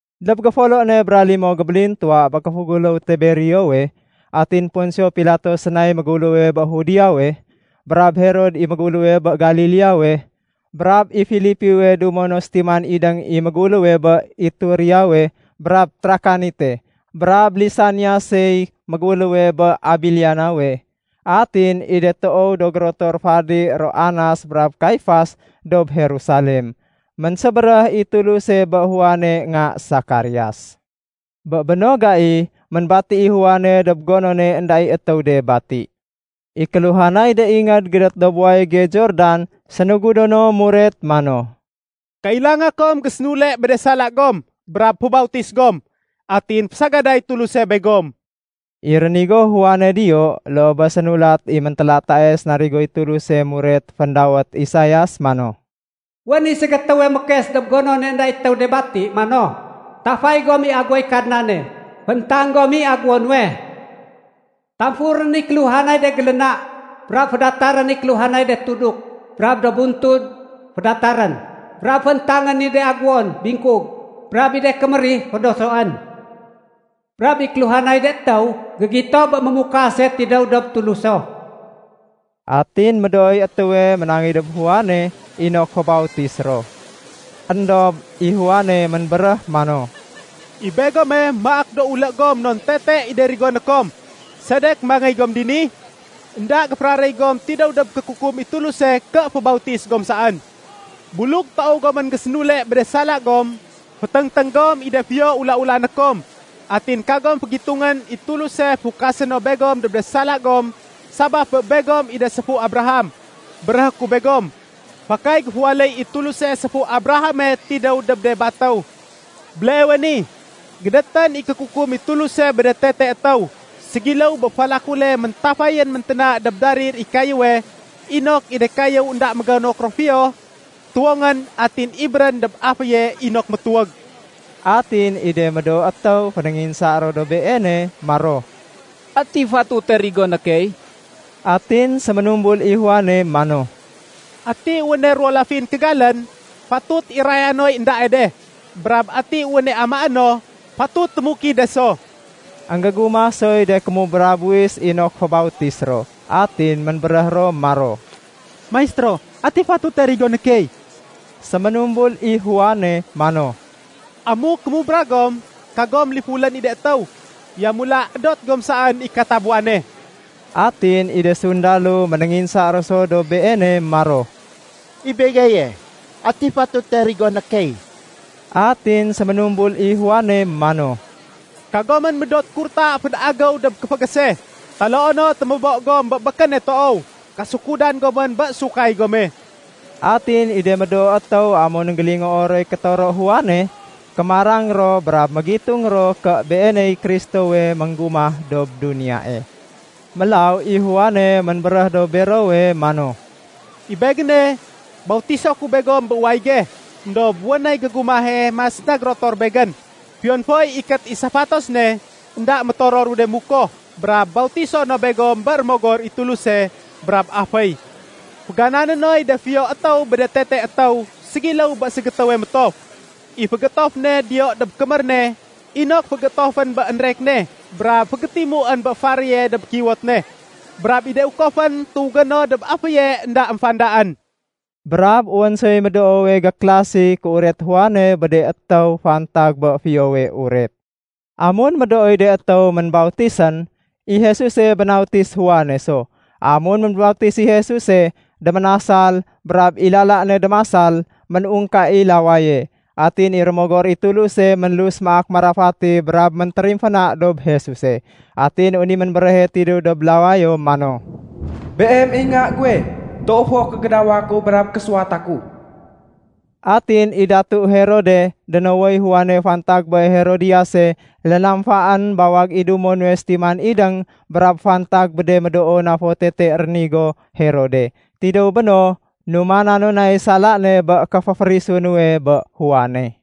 Dob géfolo ne bra limo gébélintuwa bé kéféguléw Tiberiowe, atin Ponsio Pilato sénay méguléwe bé Judeawe, brab Herod i méguléwe bé Galileawe, brab i Filipiwe dumo no sétiman idéng i méguléwe bé Itureawe brab Trakanite, brab Lisaniasey méguléwe bé Abiliniawe, atin i de toow do gérotor fadi ro Anas brab Kaifas dob Jerusalem, ménsébéréh i Tuluse bé Juane nga Sakarias. Bé béno gai, ménbati i Juane dob gonone énda i étéw de bati. I kéluhanay de ingéd gédét dob wayége Jordan sénugudo no muret mano, “Kailanga kom gésénule bé de sala gom brab fébautis gom. Atin fésagaday Tuluse begom.” I rénigo Juane diyo loo bé sénulat i méntélatae sénarigoy Tuluse muret féndawét Isaias mano, “Wén i ségétéwe mékes dob gonone énda i étéw de bati mano, ‘Tafay gom i aguwoy Kadnane. Fééntang gom i aguwo nuwe. Tamfurén i kéluhanay de géléna, brab fédatarén i kéluhanay de tuduk brab do buntud fédatarén, brab féntangén i de aguwon bingkug, brab i de kémérih fédosoén. Brab i kéluhanay de étéw gégito bé Mémukase tidéw dob Tuluso.’” Atin médooy étéwe ménangéy dob Juane inok fébautis ro. Endob i Juane ménbéréh mano, “I begome maak do ulé gom non tete i de rigoné kom. Sedek mangéy gom dini? Enda géféraréy gom tidéw dob kékukum i Tuluse ké fébautis gom saén. Buluk toow gomén gésénule bé de sala gom, féténgténg gom i de fiyo ula-ulané kom. Atin kagom fégitungén i Tuluse fukasé no begom dob de sala gom sabaf bé begom i de séfu Abraham. Béréhé ku begom, fakay géféwaléy i Tuluse séfu Abrahame tidéw dob de batéw. Béleewe ni, gédétén i kékukum i Tuluse bé de tete étéw. Ségiléw bé falakule méntafayén ménténa dob darir i kayéwe inok i de kayéw énda mégonok ro fiyo, tuwongén atin ibérén dob aféye inok métuwég.” Atin i de médoo étéw fénénginsa ro dob beene maro, “Ati fatute rigoné key?” Atin séménumbul i Juane mano, “Ati wéne ruwo lafin kégalén, fatut iraya noy éndae de. Brab ati wéne amaé no, fatut témukid de so.” Enggégumah soy de kémubra buwis inok fébautis ro. Atin ménbéréh ro maro, “Maistéro, ati fatute rigoné key?” Séménumbul i Juane mano, “Amuk kémubra gom, kagom lifulén i de étéw. Yamula édot gom saén i katabuwane.” Atin i de sundalo ménénginsa ro so dob beene maro, “I begeye, ati fatute rigoné key?” Atin séménumbul i Juane mano, “Kagomén médot kurta fénagéw dob kéfégése. Taloo no témébo gom bé békéne toow. Kasukudan gomén bé sukay gome.” Atin i de médoo étéw amun énggélingoo roy kétoro Juane, kémarang ro brab mégitung ro ké beeney Kristowe ménggumah dob duniyae. Mélaw i Juane ménbéréh dob bero mano, “I begéne, bautiso ku begom bé wayége, éndob wén nay gégumahe mas na gérotor begén. Fiyon foy ikét i safatos ne, énda métororu de mukoh. Brab bautiso no begom bé Rémogor i Tuluse brab aféy. Féganané noy de fiyo étéw bé de tete étéw ségiléw bé ségétéwe métof. I fégéétof ne diyo dob kémér ne inok fégéétofén bé énrek ne brab fégétimuén bé faréye dob kiwot ne. Brab i de ukofén tuwégé no dob aféye énda émfandaén.” Brab wén soy médoowe gékélasi kéuret Juane bé de étéw fantag bé Fiyowe Uret. Amun médooy de étéw ménbautisén, i Jesuse bénautis Juane so. Amun ménbautis i Jesuse, déménasal, brab i lala ne démasal, ménungka i lawaye. Atin i Rémogor i Tuluse ménlus maak marafati brab méntérimféna dob Jesuse. Atin wén i ménbéréhe tidéw dob lawayo mano, “Beem i Nga guwe. Toow fo kégédawa ku brab késuwata ku.” Atin i Herode datu, dénowoy Juane fantag bé Herodiyase lénamfaén bawag i dumo nuwe sétiman idéng brab fantag bé de médoo na do tete rénigo Herode. Tidéw béno, numana no nay sala ne bé kéféférisu nuwe bé Juane.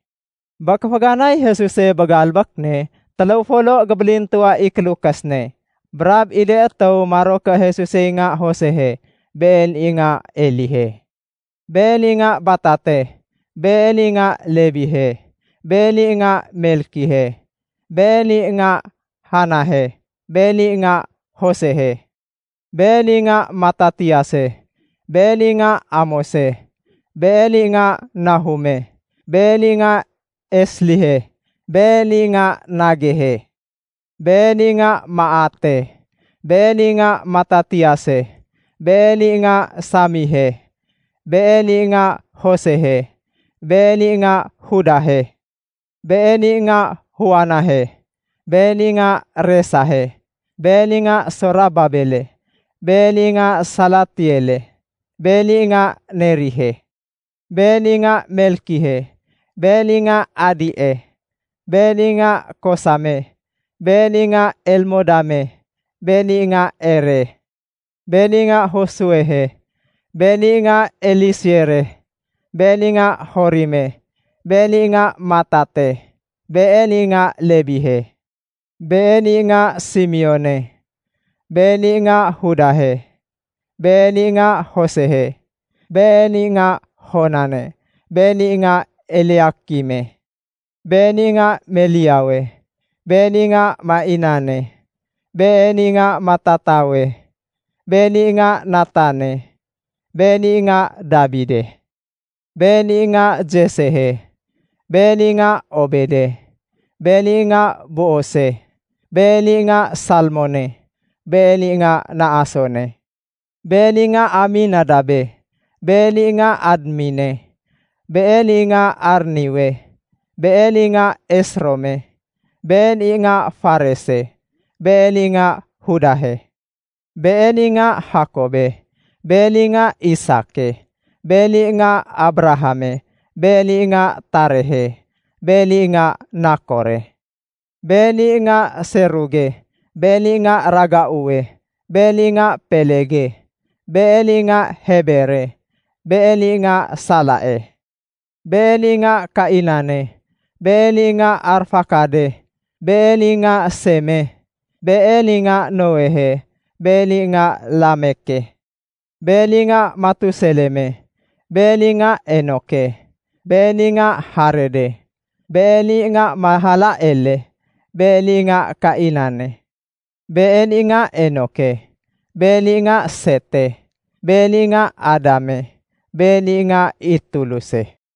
Bé kéféganay Jesuse bé galbék ne, téléw folo gébélintuwa i kélukés ne. Brab i de étéw maro ké Jesusey nga Josehe. Been i nga Elihe. Been i nga Batate. Been i nga Lebihe. Been i nga Melkihe. Been i nga Janahe. Been i nga Josehe. Been i nga Matatiase. Been i nga Amose. Been i nga Nahume. Been i nga Eslihe. Been i nga Nagehe. Been i nga Maate. Been i nga Matatiase. Been i nga Semeihe. Been i nga Josehe. Been i nga Judahe. Been i nga Joanahe. Been i nga Resahe. Been i nga Sorababele. Been i nga Salatiele. Been i nga Nerihe. Been i nga Melkihe. Been i nga Adie. Been i nga Kosame. Been i nga Elmodame. Been i nga Ere. Been i nga Josuehe. Been i nga Eliesere. Been i nga Jorime. Been i nga Matate. Been i nga Lebihe. Been i nga Simeone. Been i nga Judahe. Been i nga Josehe. Been i nga Jonane. Been i nga Eliakime. Been i nga Meleawe. Been i nga Mainane. Been i nga Matatawe. Been i nga Natane. Been i nga Dabide. Been i nga Jessehe. Been i nga Obede. Been i nga Boose. Been i nga Salmone. Been i nga Naasone. Been i nga Aminadabe. Been i nga Admine. Been i nga Arniwe. Been i nga Esrome. Been i nga Farese. Been i nga Judahe. Been i nga Jakobe. Been i nga Isake. Been i nga Abrahame. Been i nga Tarehe. Been i nga Nakore. Been i nga Seruge. Been i nga Ragauwe. Been i nga Pelege. Been i nga Hebere. Been i nga Salae. Been i nga Kainane. Been i nga Arfakade. Been i nga Seme. Been i nga Noehe. Been i nga Lameke. Been i nga Matuseleme. Been i nga Enoke. Been i nga Jarede. Been i nga Mahalaleele. Been i nga Kainane. Been i nga Enoke. Been i nga Sete. Been i nga Adame. Been i nga i Tuluse.